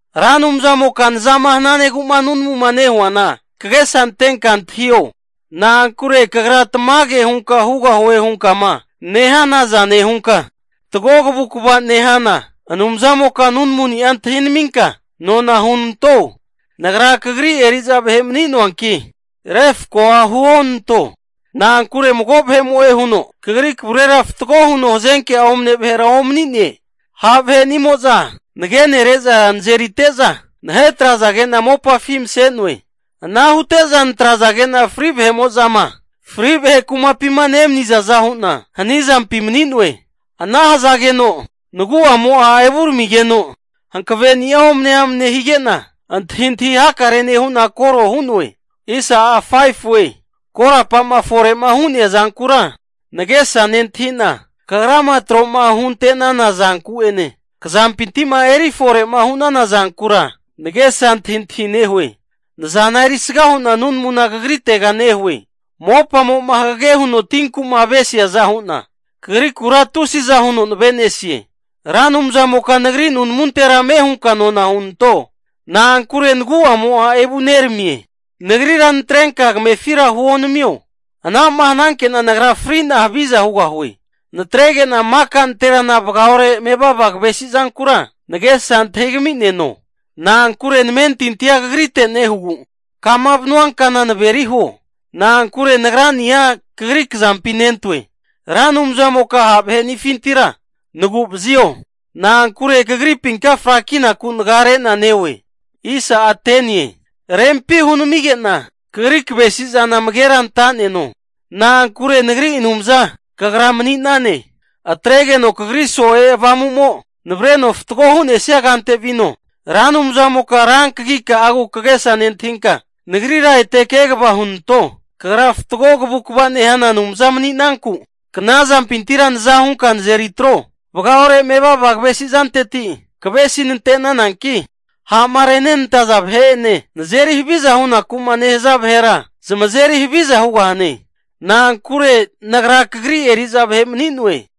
Ra Anumzamoka nazama hananegu'ma nunamuma nehuana kagesa antenka antahio. Na'ankure Kagra tamage hunka hugahue hunkama nehanaza nehunka, fatgo kavukva'ma nehana Anumzamoka nunamuni'a antahinaminka nona hunanto. Nagra Kagri eri'za vahe mani'noanki, refkoa huonanto. Na'ankure mago vahe'mo'e huno Kagri kavurera fatgo huno hazenke'a omane vahera omani'ne. Ha' vahe'nimo'za nagenere'za nazerite'za, nahetrazage'na mopafi mase'noe. Ana hute'za natrazage'na fri' vahe'mo'zama fri' vahe kumapima nemanizaza hu'na hanizampi mani'noe. Ana hazageno nagu'amo'a evuramigeno hankaveni'a omane amne hige'na antahintahi hakare nehu'na koro hu'noe. Korapa'ma fore'ma hu'nea zankura nagesa nentahi'na, kagrama tro'ma hunte'nana zanku'ene, kzampinti'ma eri fore'ma hu'nana zankura nagesa antahintahi nehue. Nazana erisga hu'na nunamuna kagritega nehue. Mopamo'ma hagage huno tinku'ma avesiaza hu'na, Kagrikura tusiza huno nave'nesie. Ra Anumzamoka nagri nunamuntera ame hunka nona hunanto. Na'ankure nagu'mo'a evu neramie. Nagrira natrenka kamefira huonamio. Ana'ma hananke'na nagra fri'na haviza hugahue. Natrege'na maka nanterana vagaore mevava kavesi'zankura nagesa antahigami'neno. Na'ankure namentintia Kagrite nehugu, kama vanua kana naveri huo. Na'ankure nagrani'a Kagri kazampi nentoe. Ra Anumzamoka ha' vahe'nifintira nagu'vazio. Na'ankure kagripinka frakinaku nagare'na neoe. Rempi hunamige'na kagri kavesi zana amagera anta'neno. Na'ankure nagri Anumza Kagra mani'nane. Atregeno Kagri so'e Avamu'mo navareno fatgo hu'nesia kante vino. Ra Anumzamoka rankagika'agu kagesa nentahinka, nagrira ete kegava hunanto. Kagra fatgo kavukva nehana Anumza mani'nanku, knazampintira naza hunka nazeri atro. Vagaore mevava kavesi zanteti kavesi nante'nananki, ha'ma renenantaza vahe'ene, nazeri haviza hunaku'ma nehaza vahera zamazeri haviza hugahane. Na'ankure nagra Kagri eri'za vahe mani'noe.